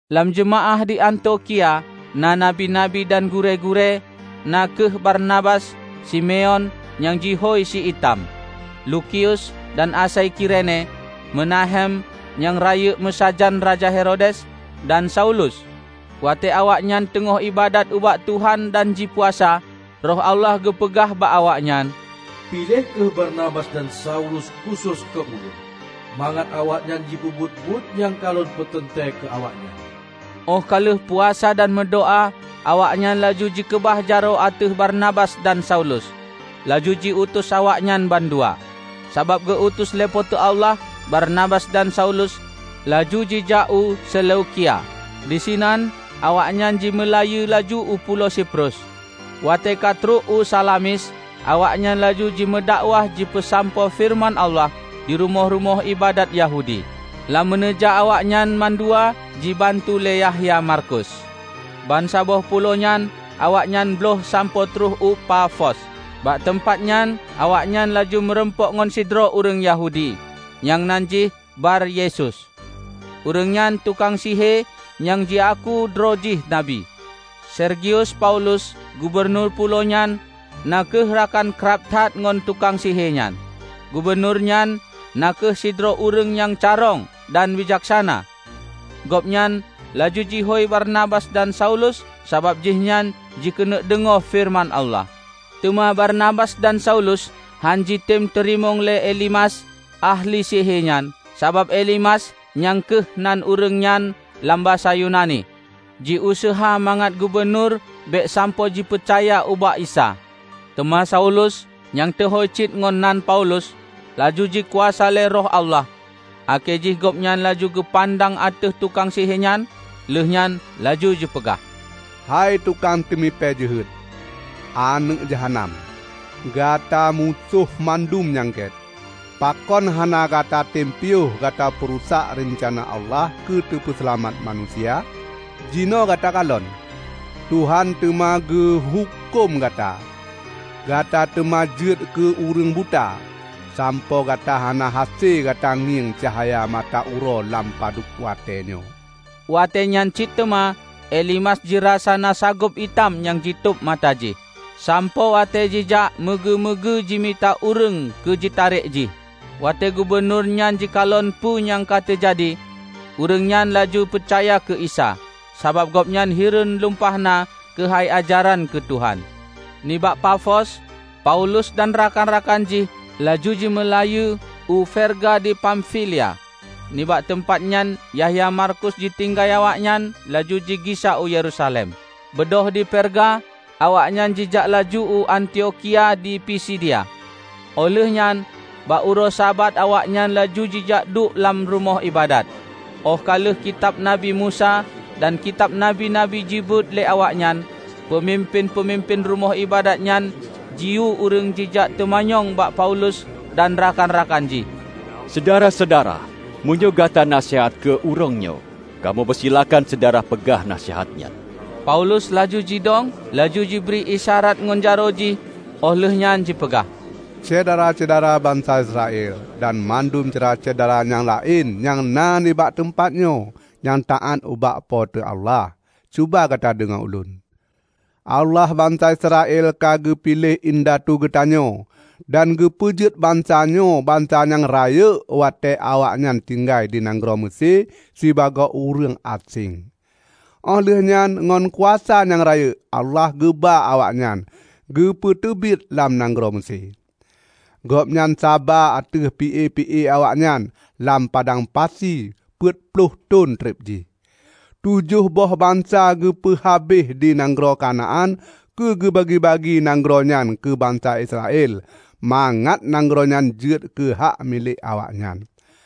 Lam jeumaáh di Antiokhia na nabi-nabi dan gurée-gurée, na kheueh Barnabas, Simeon nyang jihôi Si Itam, Lukius dan asai Kirene, Menahem nyang rayeuk meusajan Raja Herodes, dan Saulus. Watée awaknyan teungoh iébadat ubak Tuhan dan jipuasa, Roh Allah geupeugah bak awaknyan, "Piléh kheueh Barnabas dan Saulus khusos keu Ulôn, mangat awaknyan jipeubuet buet nyang ka Lôn peuteuntée keu awaknyan." Óh ka lheueh puasa dan meudoá awaknyan laju jikeubah jaroe ateueh Barnabas dan Saulus laju jiutus awaknyan bandua. Sabab geu-utus lé Po teu Allah, Barnabas dan Saulus laju jijak u Seleukia. Di sinan awaknyan jimeulayeue laju u Pulo Siprus. Watée ka trok u Salamis, awaknyan laju jimeudakwah jipeusampoe feureuman Allah di rumoh-rumoh iébadat Yahudi. Lam meuneujak awaknyan mandua jibantu lé Yahya Markus. Bansaboh pulo nyan awaknyan bloih sampoe trok u Pafos. Bak teumpat nyan awaknyan laju meurumpok ngon sidroe ureuëng Yahudi, nyang nan jih Bar Yesus. Ureuëng nyan tukang sihe nyang jiaku droe jih nabi. Sergius Paulus, gubunur pulo nyan na kheueh rakan krab that ngon tukang sihe nyan. Gubunur nyan na kheueh sidroe ureuëng nyang carông dan bijaksana. Gobnyan laju jihôi Barnabas dan Saulus sabab jihnyan jikeuneuk deungoe feureuman Allah. Teuma Barnabas dan saulus hánjitem teurimong lé Elimas ahli sihe nyan, sabab Elimas (nyan kheueh nan ureuëng nyan lam basa Yunani) jiuseuha mangat gubunur bék sampoe jipeucaya ubak Isa. Teuma Saulus -- nyang teuhôi cit ngon nan Paulus -- laju jikuasa lé Roh Allah, akhé jih gobnyan laju geupandang ateueh tukang sihe nyan, lheueh nyan laju jipeugah, "Hai tukang teumipée jeuhet, aneuëk jahanam! Gata musoh bandum nyang gét. Pakon hana gata tem piôh gata peurusak reuncana Allah keu teupeuseulamat manusia? Jinoe gata kalon, Tuhan teuma geuhuköm gata! Gata teuma jeuet keu ureuëng buta, sampoe gata hana hase gata ngieng cahya mata uroe lam padub watée nyoe." Watée nyan cit teuma Elimas jirasa na sagob itam nyang jitôb mata jih, sampoe watée jijak meugeue-meugeue jimita ureuëng keu jitarek jih. Watée gubunur nyan jikalon peue nyang ka teujadi, ureuëng nyan laju peucaya keu Isa; sabab gobnyan hireuen lumpah na keuhai ajaran keu Tuhan. Nibak Pafos, Paulus dan rakan-rakan jih laju jimeulayeue u Perga di Pamfilia. Nibak teumpat nyan Yahya Markus jitinggai awaknyan, laju jigisa u Yerusalem. Beudôh di Perga, awaknyan jijak laju u Antiokhia di Pisidia, óh lheueh nyan bak uroe Sabat awaknyan laju jijak duek lam rumoh iébadat. Óh ka lheueh Kitab Nabi Musa dan kitab nabi-nabi jibeuet lé awaknyan, peumimpén-peumimpén rumoh iébadat nyan jiyue ureuëng jijak teumanyong bak Paulus dan rakan-rakan jih, "Syedara-syedara, meunyoe gata na naseuhat keu ureuëng nyoe, kamoe peusilakan syedara peugah naseuhat nyan." Paulus laju jidong, laju jibri isyarat ngon jaroe jih, óh lheueh nyan jipeugah, "Syedara-syedara bansa Israel dan bandum syedara-syedara nyang laén nyang na nibak teumpat nyoe nyang taát ubak Po teu Allah! Cuba gata deungoe ulôn: Allah bansa Israel ka geupiléh indatu geutanyoe, dan geupeujeuet bansa nyoe bansa nyang rayeuk watée awaknyan tinggai di nanggroe Meusé sibagoe ureuëng aséng. Óh lheueh nyan ngon kuasa nyang rayeuk Allah geuba awaknyan geupeuteubiet lam nanggroe Meusé. Gobnyan saba ateueh pi-e-pi-e awaknyan lam padang pasi peuet ploh thon treb jih. Tujoh boh bansa geupeuhabéh di nanggroe Kanaan keu geubagi-bagi nanggroe nyan keu bansa Israel mangat nanggroe nyan jeuet keuhak milék awaknyan.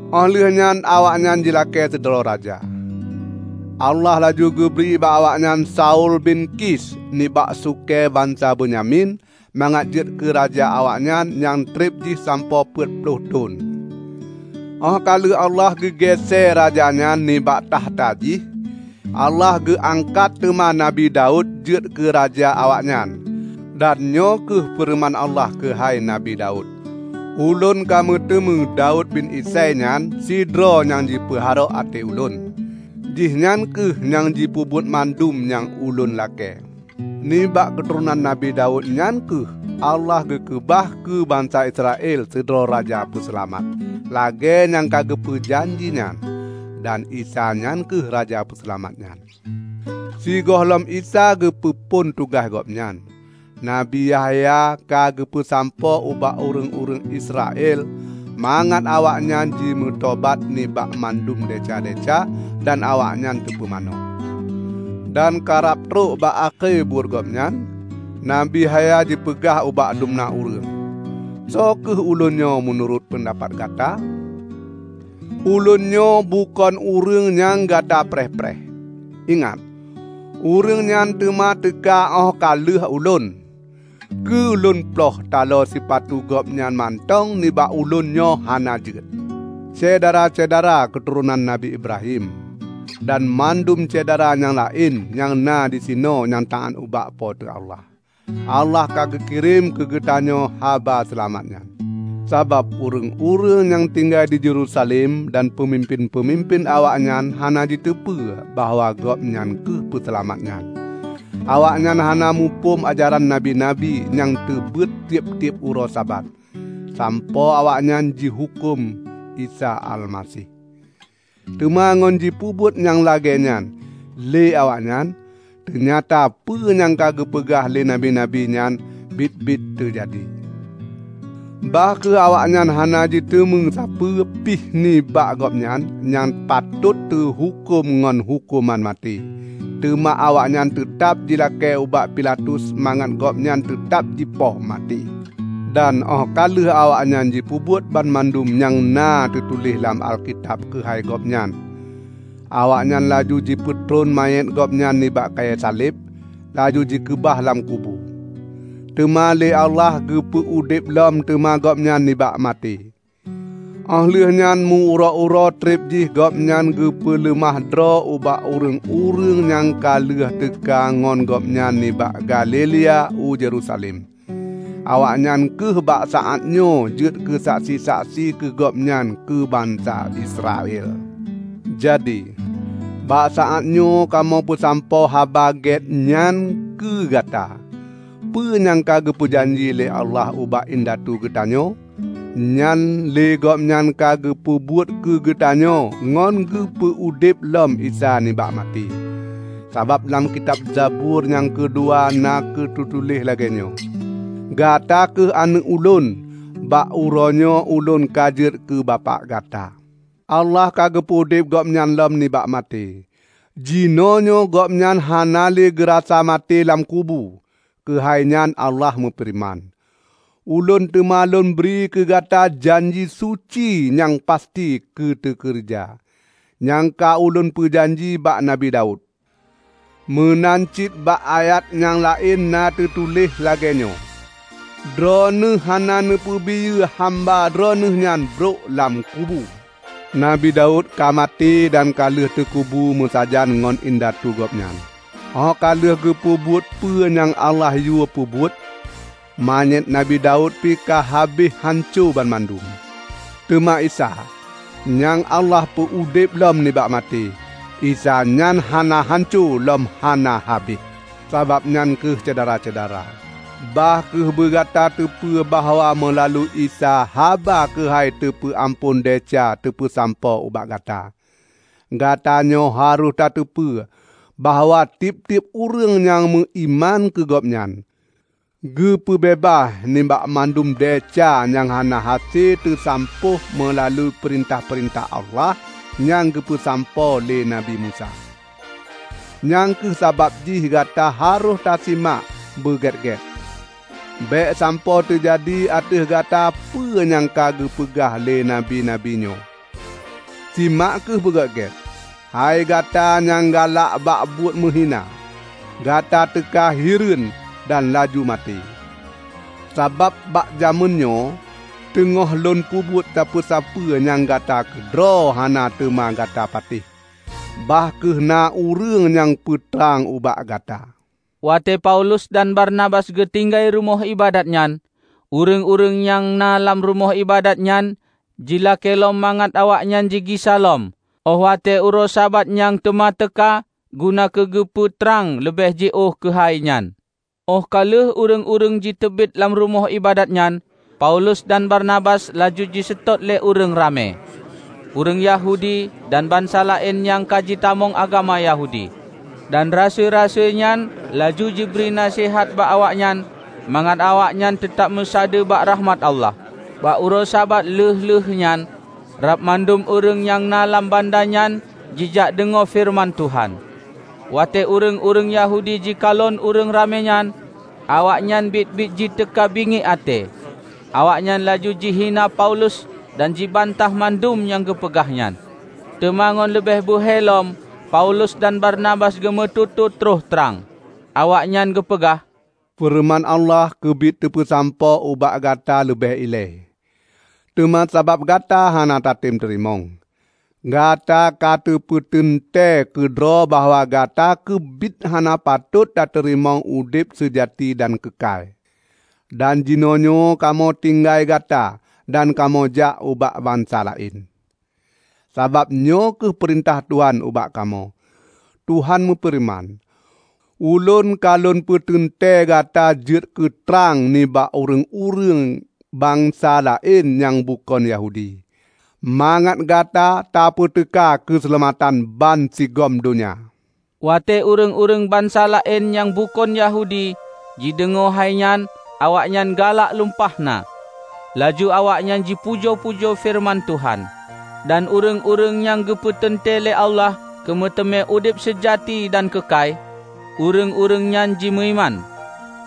Óh lheueh nyan awaknyan jilakée sidroe raja. Allah laju geubri bak awaknyan Saul bin Kis nibak sukée bansa Benyamin mangat jeuet keu raja awaknyan nyang treb jih sampoe peuet ploh thon. Óh ka lheueh Allah geu géesée raja nyan nibak takhta jih, Allah geu angkat teuma Nabi Daud jeuet keu raja awaknyan. Dan nyoe kheueh feureuman Allah keuhai Nabi Daud, 'Ulôn ka meuteumé Daud bin Isai nyan sidroe nyang jipeuharok até Ulôn. Jihnyan kheueh nyang jipeubuet mandum nyang Ulôn lakée.' Nibak keuturonan Nabi Daud nyan kheueh Allah geukeubah keu Bansa Israel sidroe Raja Peuseulamat, lagée nyang ka geupeu janji nyan. Dan Isa nyan kheueh Raja Peuseulamat nyan. Sigohlom Isa geupeu phon tugaih Gobnyan, Nabi Yahya ka geupeusampoe ubak ureuëng-ureuëng Israel mangat awaknyan jimeutobat nibak mandum desya-desya dan awaknyan teupumanö. Dan karab trok bak akhé buet gobnyan, Nabi Yahya jipeugah ubak dumna ureuëng, 'Soe kheueh ulôn nyoe meunurot peundapat gata? Ulôn nyoe bukon Ureuëng nyang gata preh-preh. Ingat, Ureuëng nyan teuma teuka óh ka lheueh ulôn; keu lôn ploih talo sipatu Gobnyan mantong nibak ulôn nyoe hana jeuet.' Syedara-syedara keuturonan Nabi Ibrahim, dan mandum syedara nyang laén nyang na disinoe nyang taát ubak Po teu Allah! Allah ka geukirém keu geutanyoe haba seulamat nyan; sabab ureuëng-ureuëng nyang tinggai di Yerusalem dan peumimpén-peumimpén awaknyan hana jiteupeue bahwa Gobnyan kheueh peuseulamat nyan. Awaknyan hana muphom ajaran nabi-nabi nyang teubeuet tieb-tieb uroe Sabat, sampoe awaknyan jihuköm Isa Almaseh. Teuma ngon jipeubuet nyang lagée nyan lé awaknyan, teunyata peue nyang ka geupeugah lé nabi-nabi nyan biet-biet teujadi. Bah kheueh awaknyan hana jiteumé sapeue pih nibak Gobnyan nyang patôt teuhuköm ngon huköman maté, teuma awaknyan teutab jilakée bak Pilatus mangat Gobnyan teutab jipoh maté. Dan óh ka lheueh awaknyan jipeubuet banmandum nyang na teutuléh lam Alkitab keuhai Gobnyan, awaknyan laju jipeutron manyét Gobnyan nibak kayée saleb, laju jikeubah lam kubu. Teuma lé Allah geupeu udeb lom teuma Gobnyan nibak maté. Óh lheueh nyan meu-uroe-uroe treb jih Gobnyan geupeuleumah droe ubak ureuëng-ureuëng nyang ka lheueh teuka ngon Gobnyan nibak Galilea u Yerusalem. Awaknyan kheueh bak saát nyoe jeuet keusaksi-saksi keu Gobnyan keu bansa Israel. Jadi, bak saát nyoe kamoe peusampoe Haba Gét nyan keu gata: Peue nyang ka geupeujanji lé Allah ubak indatu geutanyoe, nyan lé Gobnyan ka geupeubuet keu geutanyoe ngon geupeu udeb lom Isa nibak maté. Sabab lam kitab Zabur nyang keudua na teutuléh lagée nyoe, 'Gata kheueh Aneuëk Ulôn, bak uroenyoe Ulôn ka jeuet keu Bapak Gata.' Allah ka geupeu udeb Gobnyan lom nibak maté. Jinoenyoe Gobnyan hana le geurasa maté lam kubu. Keuhai nyan Allah meufeureuman, 'Ulôn teuma Lôn bri keu gata janji suci nyang pasti teukeureuja, nyang ka Ulôn meujanji bak Nabi Daud.' Meunan cit bak ayat nyang laén na na teutuléh lagée nyoe, 'Droeneueh hana neupeubiyeu hamba Droeneueh nyan brok lam kubu.' Nabi Daud ka maté dan ka lheueh teukubu meusajan ngon indatu gobnyan, óh ka lheueh geupeubuet peue nyang Allah yue peubuet. Manyét Nabi Daud pih ka habéh hanco banmandum. Teuma Isa, nyang Allah peu udeb lom nibak maté, Isa nyan hana hanco lom hana habéh. Sabab nyan kheueh syedara-syedara, bah kheueh beugata teupeue bahwa meulalu Isa haba keuhai teupeu amphon desya teupeusampoe ubak gata; gatanyoe harôh tateupeue bahwa tieb-tieb ureuëng nyang meuiman keu Gobnyan, geupeu beubaih nibak mandum desya nyang hana hase teusampôh meulalu peurintah-peurintah Allah nyang geupeusampoe lé Nabi Musa. Nyang kheueh sabab jih gata harôh tasimak beugét-gét, bék sampoe teujadi ateueh gata peue nyang ka geupeugah lé Nabi-nabi nyoe, 'Simak kheueh beugét-gét, hai gata nyang galak bak buet meuhina! Gata teuka hireuen dan laju maté! Sabab bak jamén nyoe teungoh lôn peubuet sapeue-sapeue nyang gata keudroe hana teuma gata patéh, bah kheueh na ureuëng nyang peutrang ubak gata.' " Watée Paulus dan Barnabas geutinggai rumoh iébadat nyan, ureuëng-ureuëng nyang na lam rumoh iébadat nyan jilakée lom mangat awaknyan jigisa lôn óh watée uroe Sabat nyang teuma teuka, guna keu geupeu trang leubeh jiôh keuhai nyan. Óh ka lheueh ureuëng-ureuëng jiteubiet lam rumoh iébadat nyan, Paulus dan Barnabas laju jiseutôt lé ureuëng ramé, ureuëng Yahudi dan bansa laén nyang ka jitamong agama Yahudi. Dan rasui-rasui nyan laju jibri naseuhat bak awaknyan mangat awaknyan teutab meusadeue bak rakhmat Allah. Bak uroe Sabat lheueh-lheueh nyan, rab mandum ureuëng nyang na lam banda nyan jijak deungoe feureuman Tuhan. Watée ureuëng-ureuëng Yahudi jikalon ureuëng ramé nyan, awaknyan biet-biet jiteuka bingiek até. Awaknyan laju jihina Paulus dan jibantah mandum nyang geupeugah nyan. Teuma ngon leubeh beuhe lom Paulus dan Barnabas geumeututoe troh trang. Awaknyan geupeugah, "Feureuman Allah keubiet teupeusampoe ubak gata leubeh ilée. Teuma sabab gata hana tatem teurimong, gata ka tapeuteuntée keudroe bahwa gata keubiet hana patot tateurimong udeb seujati dan keukai. Dan jinoenyoe kamoe tinggai gata dan kamoe jak ubak bansa laén. Sabab nyoe kheueh peurintah Tuhan ubak kamoe: Tuhan meufeureuman, 'Ulôn ka lôn peuteuntée gata jeuet keu trang nibak ureuëng-ureuëng bansa laén nyang bukon Yahudi, mangat gata tapeuteuka keuseulamatan bansigom donya.' " Watée ureuëng-ureuëng bansa laén nyang bukon Yahudi jideungoe hai nyan, awaknyan galak lumpah na, laju awaknyan jipujoe-pujoe feureuman Tuhan. Dan ureuëng-ureuëng nyang geupeuteuntée lé Allah keu meuteumé udeb seujati dan keukai, ureuëng-ureuëng nyan jimeuiman.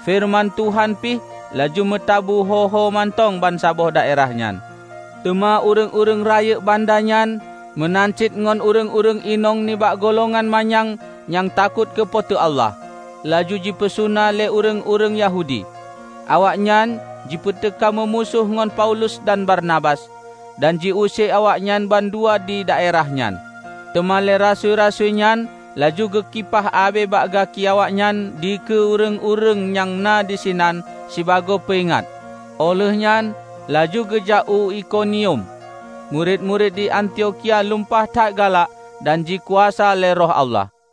Feureuman Tuhan pih laju meutabu ho-ho mantong bansaboh daerah nyan. Teuma ureuëng-ureuëng rayeuk banda nyan meunan cit ngon ureuëng-ureuëng inong nibak golongan manyang nyang takot keu Po teu Allah, laju jipeusuna lé ureuëng-ureuëng Yahudi. Awaknyan jipeuteuka meumusoh ngon Paulus dan Barnabas, dan ji use awaknyan bandua di daerah nyan. Teuma lé rasui-rasui nyan laju geukipah abée bak gaki awaknyan dikeue ureuëng-ureuëng nyang na disinan sibagoe peuingat, óh lheueh nyan laju geujak u Ikonium. Murit-murit di Antiokhia lumpah that galak dan jikuasa lé Roh Allah.